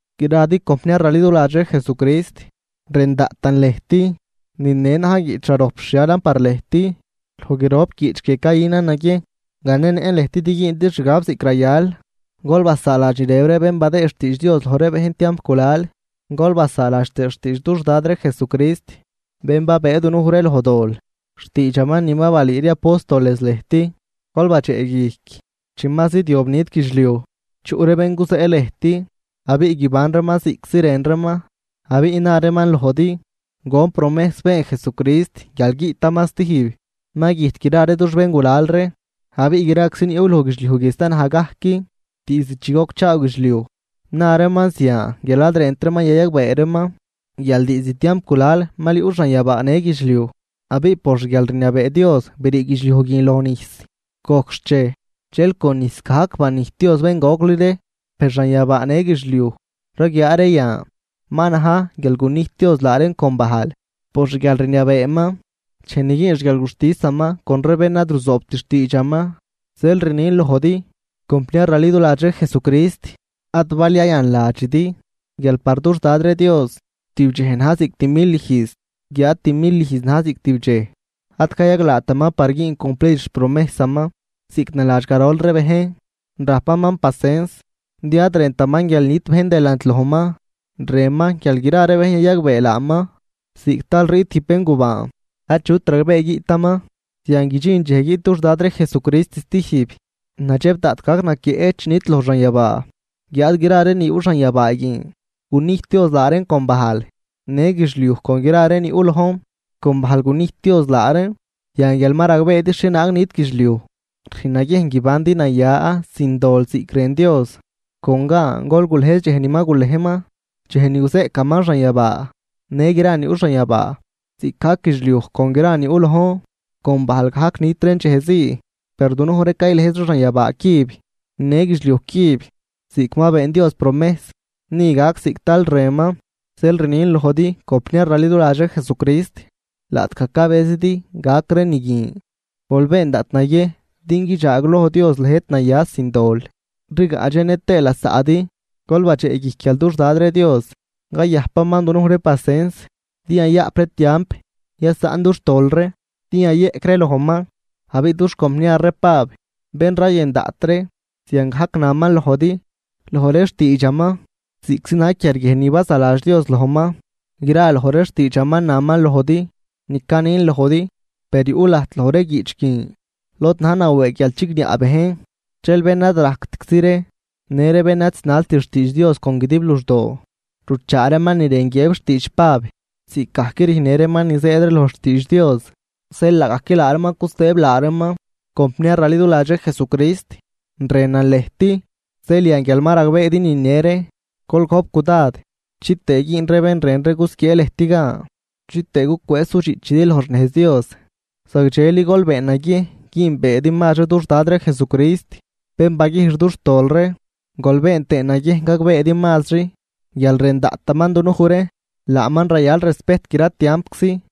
Gradi compniar raliduladx ree Jesucrist, rën daꞌtan lëjt, nine na̱j guiꞌch rarojp rxhialan par lëjt. Loj grop guiꞌch guie cayünan naguiejn ganenëꞌn lëjt din güündi xgab ziꞌc rayal. Gol basaaladx ni rëb ree bén badëëd xtiidx Dios loj ree bejn tiamp gulal, gol basaaladx tëë xtiidx dux Dad ree Jesucrist, bén babëë dunuj ree loj dol, xtiidxaman ni balüü ree apóstoles lëjt. Gol badxeꞌguijc, chi ma zidyob nit guidxliuj, chuꞌ ree bén guzeꞌ lëjt abiꞌ guiban reeman ziꞌctzi rën reeman. Abiꞌ na reeman lojdi: “¿Gon promejs been Jesucrist guial guiꞌtaman stijb? Ma güjt gra ree dux béngulal ree, abiꞌ graczi ni yuꞌ loj guidxliuj guie sta naj gajc diizd chi gocchaaw guidxliuj.” Na reeman zian, guial ad rënt reeman yayagbee reeman guial diizd tiamp gulal mal yuꞌ xanyabaa në guidxliuj abiꞌ por xguialrniabee Dios brii guidxliuj guin loj nijs. Gojc xchej, dxel con nijs gajc banijt Dios bén gocli ree. Per xanyabaa në guidxliuj raguiaa ree yan, ma na̱j guial gunijt Dios laa reen con bajl por xguialrniabeeman dxej ni güün xguialguxtisaman con ree bén ad ruzoobt xtiidxaman. Zeel rnin lojdi, compniar raliduladx ree Jesucrist, ad bal yayanladxidi, guial par dux Dad ree Dios tib dxej na̱j ziꞌc timil ijz, guiáad timil ijz na̱j ziꞌc tib dxej. Ad cayaglaataman par güün cumplid xpromejsaman, ziꞌc naladx garol ree bejn, rajpaman pasens, din ad rëntaman guial nit bejn delant lojman, rënman guial gra bejn yayagbee laaman. Ziꞌc tal riꞌt tijb béngubaan achut ragbee guiꞌtaman, zian guidxin dxej guiꞌt dux Dad ree Jesucrist stijb, nadxeb daꞌt gac naquieꞌ chi nidloj xanyabaa, guiáad gra ree ni yuꞌ xanyabaa guin, gunijt Dios laa reen con bajl, në guidxliuj con gra ree ni yuꞌ lojn, con bajl gunijt Dios laa reen. Yan, guial ma ragbeedi xhienaag nit guidxliuj, rüjn naguiejn guibandi naya sin dol ziꞌc rën Dios. Con gan gol gulëjz dxej ni ma gulejman, dxej ni guzeꞌcaman xanyabaa në gra ni yuꞌ xanyabaa, ziꞌcgajc guidxliuj con gra ni yuꞌ lojn, con bajl gajc nit reen dxej zii. Per dunuj ree caylëjz ree xanyabaa cüb në guidxliuj cüb ziꞌc ma been Dios promejs, ni gac ziꞌc tal rënman. Zeel rnin lojdi compniar raliduladx ree Jesucrist, laꞌtgaj cabëzidi gac ree ni guin, gol been daꞌt naguiejn din guidxaagloj Dios lëjt naya sin dol, rigaꞌdxenë tëë lasaꞌdi. Gol badxeꞌguijc, guial dux Dad ree Dios cayajpaman dunuj ree pasens, din yayaꞌp ree tiamp yasaꞌn dux tol ree din yayeꞌc ree lojman. Abiꞌ dux compniar ree Pab, bén rayën daꞌt ree, ziangajc naman lojdi loj ree xtiidxaman, ziꞌctzi na̱j quiarguiejn ni bazaladx Dios lojman. Gra loj ree xtiidxaman naman lojdi ni canin lojdi. Per yuꞌ lajt loj ree guiꞌch guin lod na̱j nawëëg guial chigniaꞌ bejn, dxel bén ad rajctczi ree në ree bén ad zinalt xtiidx Dios con guidib luxdoo, ruchaa reeman ni rën guiëb xtiidx Pab, ziꞌcgajc rüjnnë reeman ni zëëd ree loj xtiidx Dios, zeel laagajc reeman cusëëb laa reeman. Compniar raliduladx ree Jesucrist, rënan lëjt, zeel yan guial ma ragbeedi nine ree, gol gojp cudad chitëë güün ree bén rën ree gusquiee lëjt gan, chitëë gucwëëz sudxiꞌchidi loj xnejz Dios. Zagdxeli gol been naguiejn güünbeedi mazri dux Dad ree Jesucrist, bén baguijx dux tol ree, gol been tëë naguiejn gagbeedi mazri guial rën daꞌtaman dunuj ree. Laaman rayal respejt gra tiampczi.